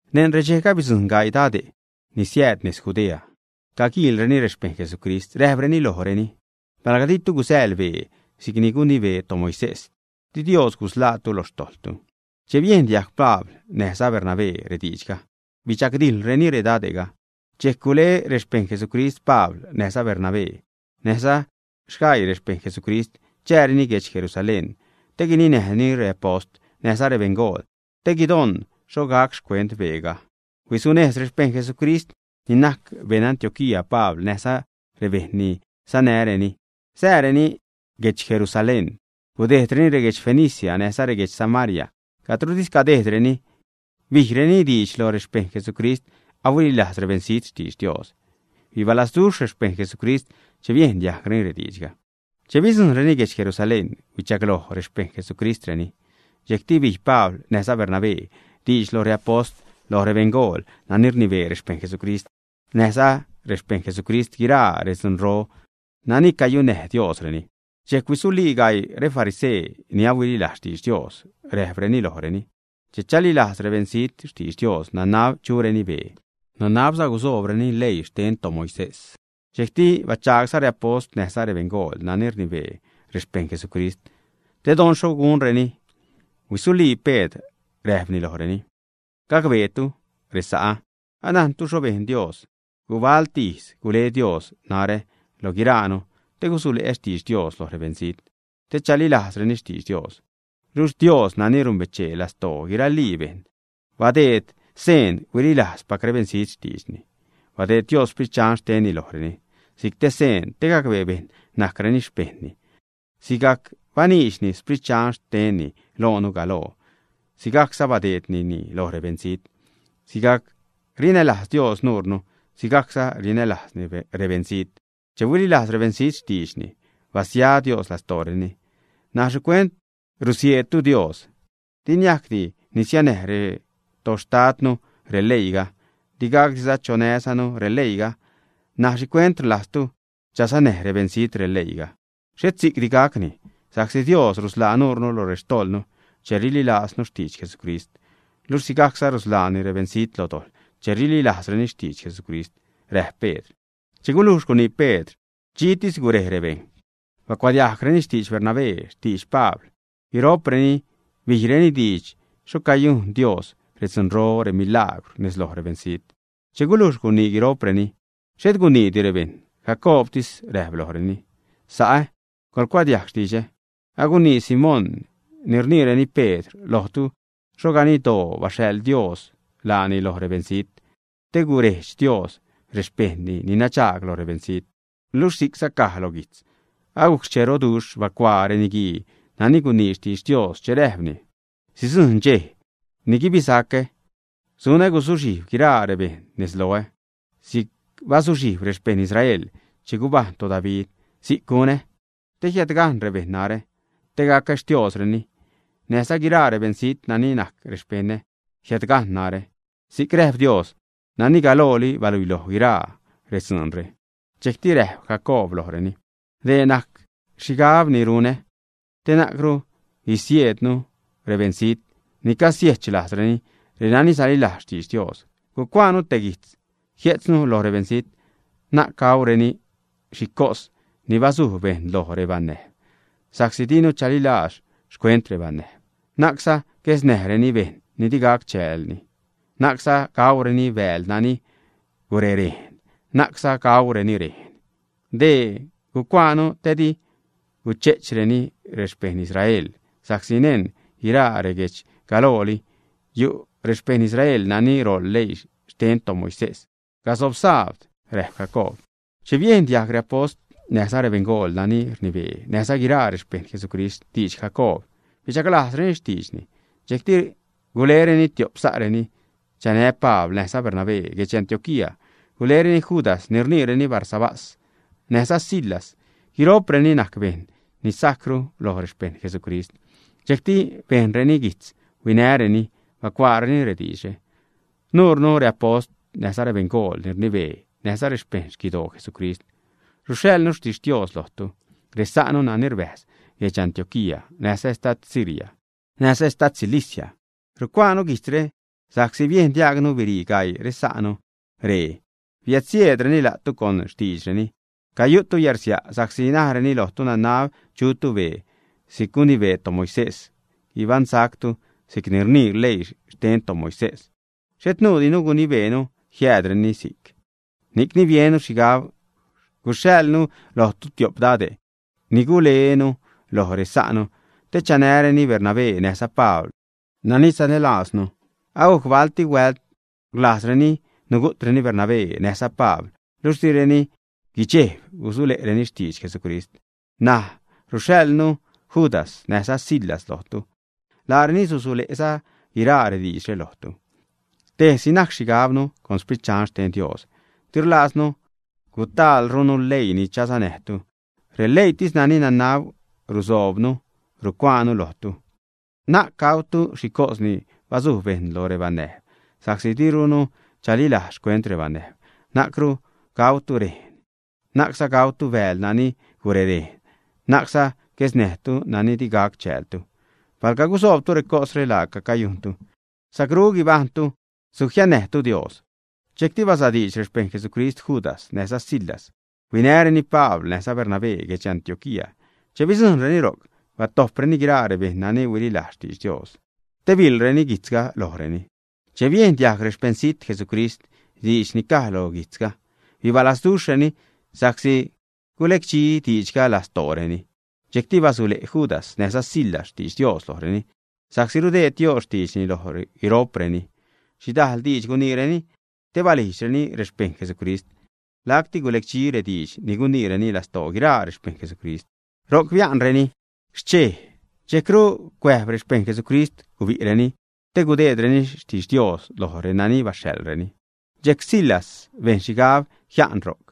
Neṉ redxejga bidzujṉ gaii dade' ni siääd nez Judea, caguluiireni rexpejṉ Jesucrist, räjpreni lojreni: ―Palga ditu gusäḻ bee si'c gunibee toMoisés, di Dios gusḻaatu lo xtojḻtu. Che biejn diajg Pabl näjza Bernabé rediidxga, bidxagdijḻreni redade'ga. Dxejc gule rexpejṉ Jesucrist Pabl näjza Bernabé näjza sgaii rexpejṉ Jesucrist chääreni guedx Jerusalén te guininäjreni reapost näjza rebeṉgool te guidon xho gac xcuent beega. Huisunejz rexpejṉ Jesucrist ni najc beṉ Antioquía Pabl näjza rebejṉ ni sanäjreni, sääreni guedx Jerusalén. Gudejdreni reguedx Fenicia, näjza reguedx Samaria. Cadrotis gudejdreni bijreni diidx lo rexpejṉ Jesucrist ahuililajz rebeṉzijt xtidx Dios. Bibalazduxh rexpejṉ Jesucrist che biejn diajgreni rediidxga. Che bidzujṉreni guedx Jerusalén, huichagloj rexpejṉ Jesucristreni. Dxejcti bij Pabl näjza Bernabé diidx lo reapost, lo rebeṉgool nani rnibee rexpejṉ Jesucrist, näjza lo rexpejṉ Jesucrist, guiraa redzunro nani cayunnäj Diosreni. Dxejc huisulii gaii refarisee ni ahuililajz xtidx Dios, räjpreni lojreni: ―Che chalilajz rebeṉzijt xtidx Dios, nanab chureni bee, nanabza gusoobreni leii xten toMoisés. Dxejcti bachagsa' reapost näjza rebeṉgool nani rnibee rexpejṉ Jesucrist, te don xho gunreni. Huisulii Pedr, räjpni lojreni: ―Guejbtu, resa'ä, anajntu xho bejn Dios gubalti ijz. Gule Dios narä lo guiraanu te gusule'ä xtidx Dios loj rebeṉzijt, te chalilajzreni xtidx Dios. Luxh Dios, nani numbechee lastoo guiralii bejṉ, badeed seen huililajzpac rebeṉzijt xtiidxni. Badeed Dios Sprit Dxan xtenni lojreni si'c te seen te gacbee bejṉ najcreni xpejṉni. Sigac baniidxni Sprit Dxan xtenni loonu galoo, si'cza badeednini lo rebeṉzijt. Sigajc rinälajz Dios nuunu, sigajcza rinälajzni rebeṉzijt. Che huililajz rebeṉzijt xtiidxni, basia Dios lastooreni. N̲aj ¿xhicuent rusieedtu Dios, ä? Di niajcdi nisianäj retoxtadnu releiiga, digacdiza chosanäjnu releiiga ṉaj. ¿Xhicuent rlajztu chasanäj rebeṉzijt releiiga? Xhet si'cti gacni sa'csi Dios rusḻaa nuure lo xtojḻnu che rililajznu xtidx Jesucrist, luxh si'cza rusḻaani rebeṉzijt lo dojḻ che rililajzreni xtidx Jesucrist ―räjp Pedr. Che gulujx gunii Pedr, dxitis gurej rebejṉ, bacuadiajgreni xtidx Bernabé, xtidx Pabl. Guiro'preni bijreni diidx xho cayujn Dios redzunro, remilagwr nez lo rebeṉzijt. Che gulujx gunii guiro'preni, xhet guniidi rebejṉ. Jacoobtis räjp lojreni: ―Sa'ä, coḻcuadiajg xtidxä. Agunii Simón ni rniireni Pedr lojtu xho ganiddoo baxhaḻ Dios laani lo rebeṉzijt te gurejdx Dios rexpejṉni ni nadxaag lo rebeṉzijt. Luxh si'cza caj lo guijtz. Agujc xcheroduxh bacuaa reniguii nani gunii xtidx Dios, che räjpni: Sidzujṉ dxej ni guibisacä. Sunä guzuxhijb guiraa rebejṉ nez loä si'c bazuxhijb rexpejṉ Israel che gubajṉ toDavid. Si'c gunä, te jiädgajṉ rebejṉ narä te gacä Xtiosreni, näjza guiraa rebeṉzijt nani najc rexpeṉä jiädgajṉ narä, si'c räjp Dios nani galooli baluiloj guiraa redzuunre. Dxejcti räjp Jacoob lojreni: ―Dee najc xhigab ni runä. Na'cru gusieednu rebeṉzijt ni cagusiechlajzreni, renani salilajz xtidx Dios. Gucuaanu te guijtz, jie'tznu lo rebeṉzijt: Na'c gaureni xhi cos ni basuj bejṉ loj rebanäjb, sa'csi dinu chalilajz xcuent rebanäjb. Na'cza guesnäjreni bejṉ ni di gac chäälni, na'cza gaureni bääl nani gurerejn, na'cza gaureni rejn. Dee gucuaanu te di guche'chreni xpejṉ Israel sa'csi neṉ guiraa reguejdx galooli yu' rexpejṉ Israel nani roḻ leii xten toMoisés gasob sabd ―räjp Jacoob. Che biejn diajg reapost näjza rebeṉgool nani rnibee, näjza guiraa rexpejṉ Jesucrist xtidx Jacoob, bichaglajzreni xtiidxni. Dxejcti gulereni tiop sa'reni chanä Pabl näjza Bernabé guedx Antioquía. Gulereni Judas ni rniireni Barsabás näjza Silas. Guiro'preni najc bejṉ ni sajcru loj rexpejṉ Jesucrist. Dxejcti bejnreni guijtz huinäreni. Bacuaareni rediidxre: “Nuure reapost, näjza rebeṉgool ni rnibee, näjza rexpejṉ xquidoo Jesucrist ruxhaḻnu xtixtios lojtu, resa'nu nani rbäjz guedx Antioquía näjza estad Siria näjza estad Cilicia. Rucuaanu guijtzre sa'csi biejn diaagnu birii gaii resa'nu ree biädsieedreni la'tu con xtiidxreni, cayu'tu yärsia' sa'csi najreni lojtu nanab chutu bee si'c gunibee toMoisés, guibajṉzatu si'c rnii leii xten toMoisés. Xhet nuudinu gunibeenu jiädniireni si'c. Ni'cni biennu xhigab guxhaḻnu lojtu tiop dade' ni gulenu loj resa'nu te chanäreni Bernabé näjza Pabl, nani sanälaaznu. Agajc balti huält rlajzreni nugu'treni Bernabé näjza Pabl, luxh direni guidxejb gusule'reni xtidx Jesucrist. N̲aj ruxhaḻnu Judas näjza Silas lojtu. Laareni susule'za guiraa rediidxre lojtu. Tejsi najc xhigabnu con Sprit Dxan xten Dios. Di rlaaznu gutaalrunu leii ni chasanäjtu. Releiitis nani nanab rusoobnu rucuaanu lojtu. Na'c gautu xhicos ni basuj bejṉ lo rebanäjb, sa'csi dirunu chalilaaz xcuent rebanäjb. Na'cru gautu rejn, na'cza gautu bääl nani gurerejn, na'cza guesnäjtu nani digac chäältu. Palga gusoobtu recosre, laaca cayujntu. Sacrú guibajṉtu. Sujiannäjtu Dios.” Dxejcti basadiidx rexpejṉ Jesucrist Judas näjza Silas huinäreni Pabl näjza Bernabé guedx Antioquía. Che bidzujṉreni ro'c batojpreni guiraa rebejṉ nani huililajz xtidx Dios te biḻreni guijtzga lojreni. Che biejn diajg rexpeṉzit Jesucrist diidx ni caj lo guijtzga, bibalazduxhreni sa'csi gulecdxi diidxga lastooreni. Dxejcti basule' Judas näjza Silas xtidx Dios lojreni, sa'csi rudeed Dios xtiidxni loj guiro'preni. Xhidajl diidx guniireni te balijdxreni rexpejṉ Jesucrist. Lacti gulecdxi rediidx ni guniireni lastoo guiraa rexpejṉ Jesucrist. Ro'c bia'nreni xchej, dxejcru cuäjb rexpejṉ Jesucrist gubi'reni te gudeedreni xtixtios loj reni baxhaḻreni. Dxejc Silas bejn xhigab jia'nni ro'c.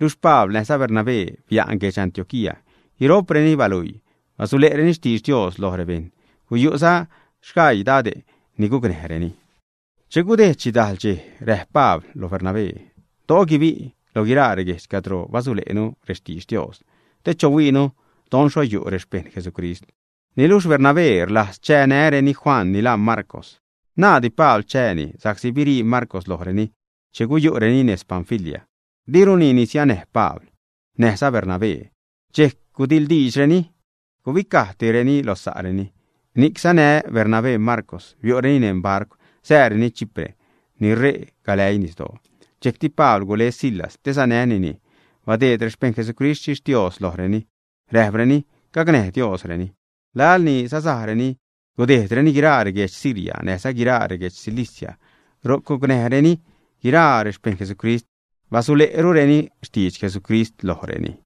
Luxh Pabl näjza Bernabé bia'n guedx Antioquía. Guiro'preni baluii, basule'reni xtidx Dios loj rebejṉ. Guyu'za sgaii dade' ni gucnäjreni. Che gudejd xhidajl dxej, räjp Pabl lo Bernabé: ―Do'o guibi' lo guiraa reguejdx cadro basule'nu rextidx Dios te chohuiinu don xho yu' rexpejṉ Jesucrist. Niluxh Bernabé rlajz chanäreni Juan ni laa Marcw. Naaddi Pabl chääni, sa'csi birii Marcw lojreni che guyu'reni nez Panfilia, diruni nisianäj Pabl näjza Bernabé. Dxejc gudiḻdiidxreni. Gubicajtireni lo sa'reni. Ni'c sanä Bernabé Marcw, biu'reni neṉ barcw, sääreni Chipre ni ṟe' galäii nisdoo. Dxejcti Pabl gule Silas te sanänini. Badeed rexpejṉ Jesucrist xtixtios lojreni, räjpreni gacnäj Diosreni. Laḻ ni sasajreni gudejdreni guiraa reguedx Siria näjza guiraa reguedx Cilicia, ro'c gucnäjreni guiraa rexpejṉ Jesucrist, basule'rureni xtidx Jesucrist lojreni.